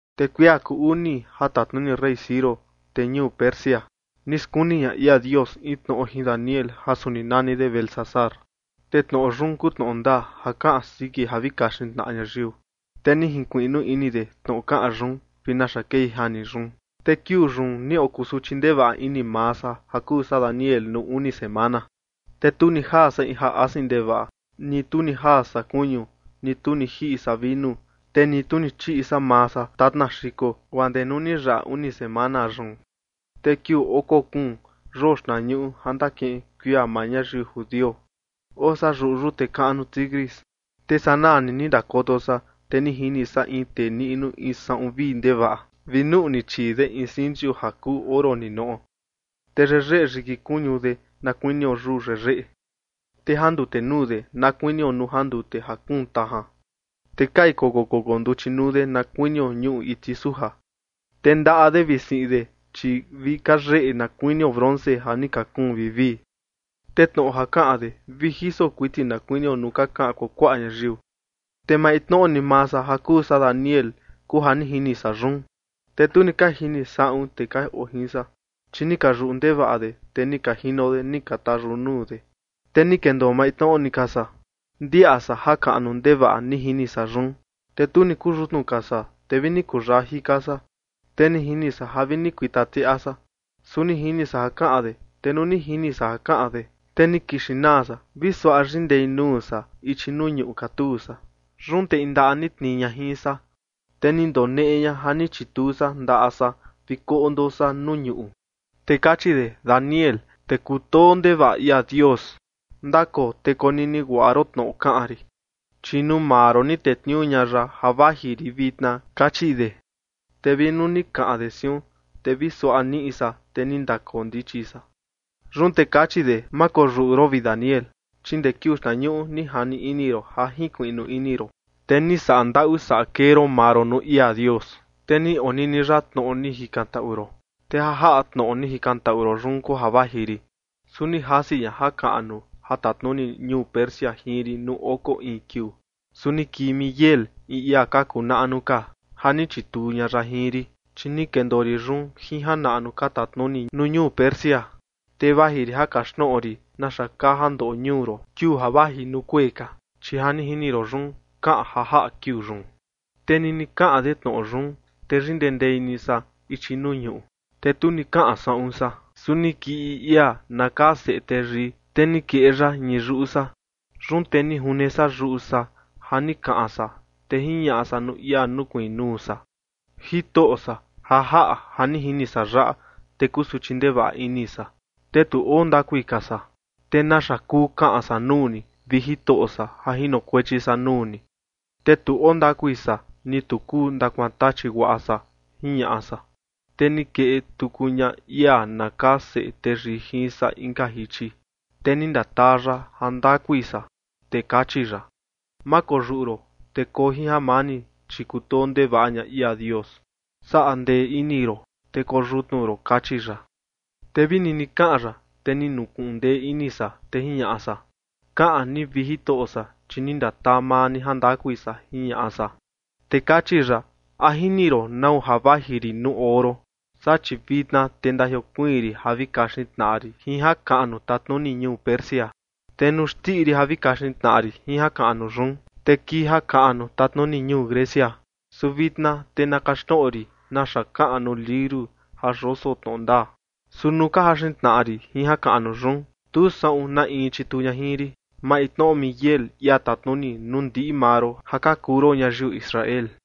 Te kuia kuu uni ja tatnuni rey Ciro, tee ñuu Persia, ni skuni ña ia Dios in tnoꞌo jin Daniel ja suni nani de Beltsasar. Te tnoꞌo yun kuu tnoꞌo ndaa ja kaꞌan siki ja vi kaxin tnaꞌa ñayiu, te ni jinkuiꞌnu ini de tnoꞌo kaꞌan yun vi naxa kei jani yun. Te kiuu yun ni okusuchi ndevaꞌa ini maa san ja kuu san Daniel nuu uni semana. Te tu ni jaa san in ja asin ndevaꞌa, ni tu ni jaa san kuñu, ni tu ni jiꞌi san vinu, te ni tu ni chiꞌi san maa san tatna xiko, guaa ndee nuu ni yaꞌa uni semana yun. Te kiuu oko kuun yoo xtnañuꞌu ja ndakiꞌin kuia maa ñayiu judio, oo san yuꞌu yute kaꞌnu Tigris. Te sanaa ni ndakoto san, te ni jini san in tee niꞌnu in saꞌun vii ndevaꞌa vi nuꞌni chii de in sinchu ja kuu oro ninoꞌo. Te yeyeꞌe yiki kuñu de na kuinio yuu yeyeꞌe, te jandute nuu de na kuinio nuu jandute ja kuun tajan, te kai koko koko nduchi nuu de na kuinio ñuꞌu iti suja. Te ndaꞌa de vi siꞌin de, chi vi ka yeyeꞌe na kuinio bronce ja ni ka kuun vivii. Te tnoꞌo ja kaꞌan de vi jiso kuiti na kuinio nuu ka kaꞌan kuakuaꞌa ñayiu. Te maintnoꞌo ni maa san ja kuu san Daniel, kuu ja ni jini san yun. Te tu ni ka jini saꞌun tee ka oo jin san, chi ni ka yuꞌu ndevaꞌa de, te ni ka jino de ni ka tayuꞌu nuu de. Te ni kendoo maintnoꞌo ni ka san, ndiaꞌa san jakaꞌnu ndevaꞌa ni jini san yun. Te tu ni kuyutnu ka san, te vi ni kuyaa jika san, te ni jini san ja vi ni kuita tiaꞌa san. Su ni jini san ja kaꞌan de. Te nuu ni jini san ja kaꞌan de, te ni kixin naa san, vi suaꞌa yindei nuu san ichi nuu ñuꞌu katuu san. Yun te in ndaꞌa ni tnii ña jin san, te ni ndoneꞌe ña ja ni chituu san ndaꞌa san vi koꞌndo san nuu ñuꞌu. Te kachi de: ―Daniel, tee kutoo ndevaꞌa ia Dios, ndakoo te konini guaꞌa ron tnoꞌo kaꞌan rin, chi nuu maa ron ni tetniuu ña ya ja vaji rin vitna ―kachi de. Te vi nuu ni kaꞌan de siun, te vi suaꞌa niꞌi san, te ni ndakoo ndichi san. Yun te kachi de: ―Ma koyuꞌu ron, vi Daniel, chi ndee kiuu xtnañuꞌu ni jani ini ron ja jinkuiꞌnu ini ron, te ni saꞌa ndaꞌu saꞌa kee ron maa ron nuu ia Dios, te ni onini ya tnoꞌo ni jikantaꞌu ron, te ja jaꞌa tnoꞌo ni jikantaꞌu ron yun kuu ja vaji rin. Su ni jasi ña jakaꞌnu ja tatnuni ñuu Persia jin rin nuu oko in kiuu. Su ni kii Miguel, in ia ka kuu naꞌnu ka, ja ni chituu ña ya jin rin, chi ni kendoo rin yun jin janaꞌnu ka tatnuni nuu ñuu Persia. Te vaji rin ja kaxtnoꞌo rin naxa kaa ja ndoꞌo ñuu ron kiuu ja vaji nuu kuee ka, chi ja ni jini ron yun, kaꞌan ja jaꞌa kiuu yun. Te nini kaꞌan de tnoꞌo yun, te yindendei ni san ichi nuu ñuꞌu, te tu ni kaꞌan saꞌun san. Su ni kii in ia na kaa Seꞌe Teyii, te ni keꞌe ya ñii yuꞌu san. Yun te ni june san yuꞌu san ja ni kaꞌan san, te jiñaꞌa san nuu ia nukuiin nuu san: ―Jitoꞌo san, ja jaꞌa ja ni jini san yaꞌa, te kusuchi ndevaꞌa ini san, te tu oo ndakui ka san. ¿Te naxa kuu kaꞌan san nuu ni, vi Jitoꞌo san, ja jinokuechi san nuu ni, te tu oo ndakui san, ni tu kuu ndakuantachi guaꞌa san? ―jiñaꞌa san. Te ni keꞌe tuku ña ia na kaa Seꞌe Teyii jin san inka jichi, te ni ndataa ya jandakui san. Te kachi ya: ―Ma koyuꞌu ron, te koo jin jamani, chi kutoo ndevaꞌa ña ia Dios. Saꞌa ndee ini ron, te koo yutnu ron ―kachi ya. Te vi nini kaꞌan ya, te ni nukuꞌun ndee ini san, te jiñaꞌa san: ―Kaꞌan ni, vi Jitoꞌo san, chi ni ndataa maa ni jandakui san ―jiñaꞌa san. Te kachi ya: ―¿A jini ron nau ja vaji rin nuu oo ron? Saa, chi vitna te ndajiokuiin rin ja vi kaxin tnaꞌa rin jin jakaꞌnu tatnuni ñuu Persia. Te nuu xndiꞌi rin ja vi kaxin tnaꞌa rin jin jakaꞌnu yun, te kii jakaꞌnu tatnuni ñuu Grecia. Su vitna te na kaxtnoꞌo rin naxa kaꞌan nuu liuru ja yoso tnoꞌo ndaa. Su nuu ka jaxin tnaꞌa rin jin jakaꞌnu yun, tu saꞌun na in chituu ña jin rin, maintnoꞌo Miguel, ia tatnuni nuu ndiꞌi maa ron ja ka kuu ron ñayiu Israel.